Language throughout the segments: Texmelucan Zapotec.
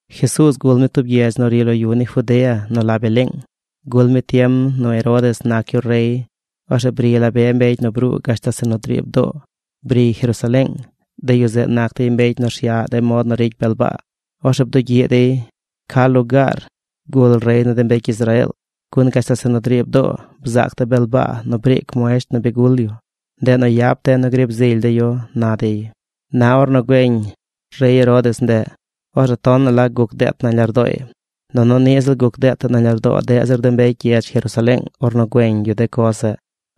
Jesuuz gul mi tub gyedz nu ri lo yu ni Judea nu la Beleeng. Gul mi tiem nu Herodes nac yu rey. Orzeꞌ bri la be mbecy nu bruu gashtal zeꞌ nu driib doo, briy Jerusaleeng. De yu zeꞌ nac dey mbecy nu rsyaꞌ de mod nu ricy bel baa. Orzeꞌ bdugyiꞌ dey: ―¿Ca lugaar gul rey ni de mbecy Israeel? Gun gashtal zeꞌ nu driib doo bzaac de̱ bel baa nu briic muesht nu bi gul yu. Ndeꞌ nu yap de̱ nu griib zily de̱ yu ―na dey. Na ornu güeñ rey Herodes ndeꞌ, orzeꞌ tonaꞌ la guc deet nañ lardooy. Nunu ni ziꞌl guc deet nañ lardoo deꞌ zir de mbecy gyedz Jerusaleeng ornu güeñ yu de coz zeꞌ.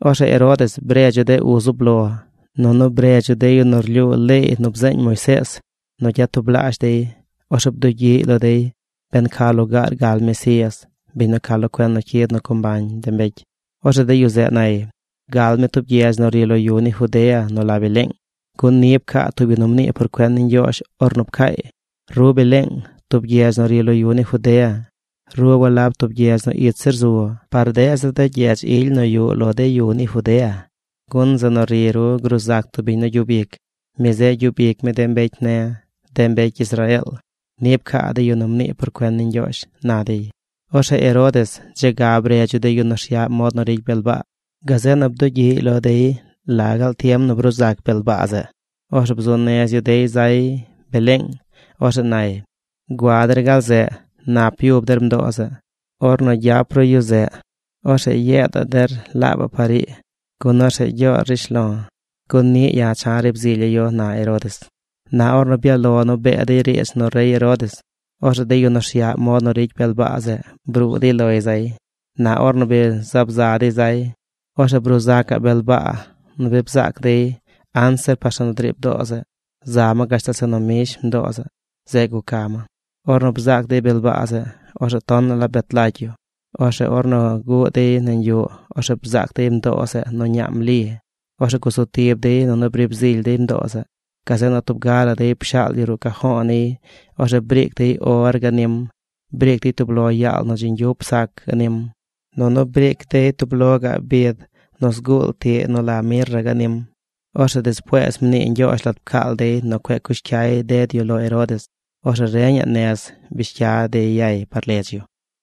Orzeꞌ Herodes bredz yu de uz zub lo, nunu bredz yu de yu nu rlyuu leey nu bzeeñ Moisees nu gyatublaazh dey. Orzeꞌ bdugyiꞌy lo dey ben ca lugaar gal Mesías, biñ nu ca lo cuen nu cyid nu co mbañ de mbecy. Orzeꞌ de yu zeꞌ nay: ―Gal mi tub gyedz nu ri lo yu ni Judea nu la Beleeng, gun ni pcaa tub yu nu mnii por cuen ni Ñgyoozh ornu pcaay: Ru Beleeng, tub gyedz nu ri lo yu ni Judea, ru walab tub gyedz nu ich zir zu par deꞌ zir de gyedz ily nu yuꞌ lo de yu ni Judea, gun zeꞌ nu ri ru gruu zac tub biñ nu gyub ic. Mi zeꞌ gyub ic mi de mbecy ne̱, de mbecy Israeel. Ni pcaa de yu nu mnii por cuen ni Ñgyoozh ―na dey. Orzeꞌ Herodes dze ga bredz yu de yu nu rsyaꞌ mod nu ricy bel baa. Gazeꞌ nu bdugyiꞌy lo dey la gaal tiem nu bruu zac bel baa zeꞌ. Orzeꞌ bzuu nez yu dey zay Beleeng. Orzeꞌ nay: ―Gua der gal zeꞌ. Nap yub der mdoo zeꞌ. Ornu gyap ru yu zeꞌ, orzeꞌ yeedaꞌ der laabaꞌ par ii gun orzeꞌ gyoor rishlo̱. Gun niꞌ ya̱ cha̱ griib zilya̱ yu ―na Herodes. Na ornu byaꞌ lo nu bee dey riidz nu rey Herodes, orzeꞌ de yu nu rsyaꞌ mod nu ricy bel baa zeꞌ bruu dey loy zay. Na ornu bi zaab za dey zay, orzeꞌ bruu zacaꞌ bel baa nu bi bzaac dey anzir par zeꞌ nu driib doo zeꞌ. Za ma gashtal zeꞌ nu mbish mdoo zeꞌ. Zeꞌ guca ma. Ornu bzaac dey bel baa zeꞌ, orzeꞌ tonaꞌ la bet lagy yu. Orzeꞌ ornu guꞌ dey nañ yuꞌ, orzeꞌ bzaac dey mdoo zeꞌ nu ñaam Li. Orzeꞌ gusu tib dey nunu briib zily dey mdoo zeꞌ. Gazeꞌ nu tub ga la dey pshaal yu ruꞌ cajo̱o̱ niy. Orzeꞌ briic dey or ganim. Briic dey tub lo yaal nap nu dzi ñgyup sac ganim. Nunu briic dey tub lo gaꞌ bid nu zguul tiꞌ nu la mirra ganim. Orzeꞌ despuees mnii Ñgyoozh lat pcaal dey nu cueꞌ cush cyay ded yu lo Herodes. Orzeꞌ reñaꞌ nez bish cya dey yay par ledz yu.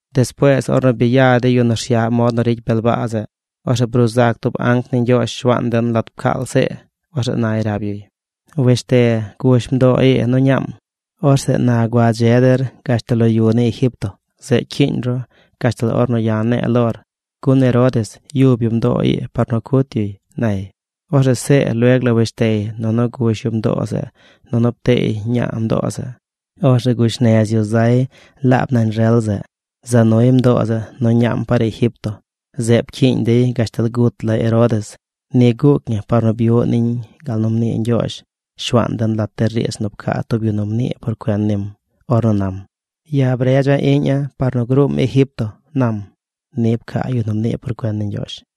Despuees ornu bi ya de yu nu rsyaꞌ mod nu ricy bel baa zeꞌ, orzeꞌ bruu zac tub anc ni Ñgyoozh Shuaan den lat pcaal See. Orzeꞌ nay rab yuy: ―Wesh te. Gush mdoo ii nu ñaam. Orzeꞌ na gua dze der gashtal lo de yu ni Egipto. Zeꞌ cyiiñ ru gashtal ornu ya̱ ne̱e̱ lor, gun Herodes yub yu mdoo ii par nu cut yuy ―nay. Orzeꞌ See lueg la wesh tey, nunu gush yu mdoo zeꞌ, nunu pteey ñaa mdoo zeꞌ. Orzeꞌ gush nez yu zay laab nañ rel zeꞌ, za nuy mdoo zeꞌ nu ñaam par Egipto. Zeꞌ pcyiiñ dey gashtal gut la Herodes. Ni guuc ñi par nu byuꞌ niñ gal nu mnii Ñgyoozh Shuaan den lat de riidz nu pcaa tub yu nu mnii por cuen nim ornu nam: “Ya̱ bredza̱ iꞌña̱ par nu gruum Egipto”, nam. Ni pcaa yu nu mnii por cuen ni Ñgyoozh.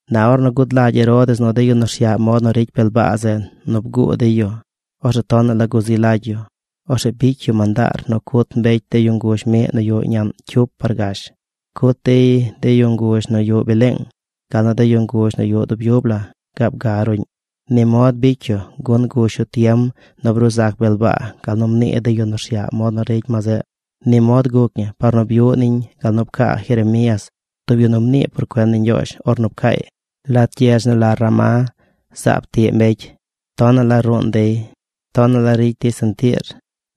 Na ornu gud lagy Herodes nu de yu nu rsyaꞌ mod nu ricy bel baa zeꞌ nu bguu dey yu, orzeꞌ tonaꞌ la guzi lagy yu. Orzeꞌ bicy yu mandaar nu cut mbecy de yu nguzh miꞌ nu yuꞌ ñaꞌn cyup par gash. Cut dey de yu nguzh nu yuꞌ Beleeng gal nu de yu nguzh nu yuꞌ dub yub la gaab ga ruꞌñ. Ni mod bicy yu gun gush yu tiem nu bruu zac bel baa gal nu mnii de yu nu rsyaꞌ mod nu ricy ma zeꞌ. Ni mod guc ñi par nu byuꞌ niñ gal nu pcaa Jeremías, tub yu nu mnii por cuen ni Ñgyoozh ornu pcaay: Lat gyedz nu la Ramá zaab tiꞌ mbecy. Tonaꞌ la ruun dey. Tonaꞌ la ricy dey sentiir.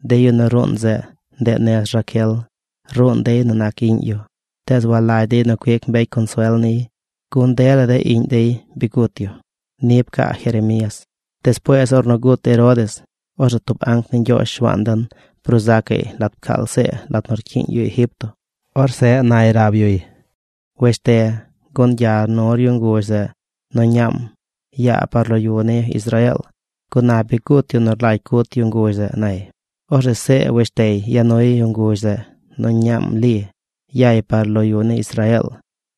De yu nu ruun zeꞌ, ndeꞌ nez Raquel. Ruun dey nu nac iꞌñ yu. Tees walagy dey nu cuic mbecy consuel niy gun dela de iꞌñ dey bi gut yu. Ni pcaa Jeremías. Despuees ornu gut Herodes, orzeꞌ tub anc ni Ñgyoozh Shuaan den bruu zacaꞌy lat pcaal See lat nu rcyiiñ yu Egipto. Orzeꞌ nay rab yuy: ―Wesh te. Gun gyar nu yu nguzh zeꞌ nu ñaam. Yaa par lo de yu ni Israeel, gun na bi gut yu nu rlagy cut yu nguzh zeꞌ ―nay. Orzeꞌ See wesh tey ya nuy yu nguzh zeꞌ nu ñaam Li. Yay par lo de yu ni Israeel.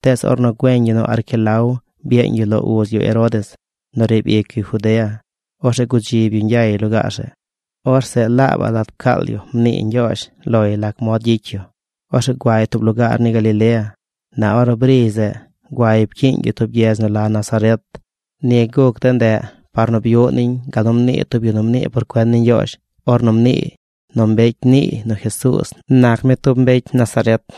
Tees ornu güeñ yu nu Arquelao byeeñ yu lo uz yu Herodes nu riib ic yu Judea, orzeꞌ gudzib yu ñgyay lugaar zeꞌ. Orzeꞌ laabaꞌ lat pcaal yu mnii Ñgyoozh loy lac mod gyicy yu. Orzeꞌ guay tub lugaar ni Galilea. Na ornu briy zeꞌ, guay pcyiiñ yu tub gyedz nu la Nazaret. Ni guc de ndeꞌ par nu byuꞌ niñ gal nu mnii tub yu nu mnii por cuen ni Ñgyoozh ornu mniiy nu mbecy niiy nu Jesuuz nac mi tub mbecy Nazaret.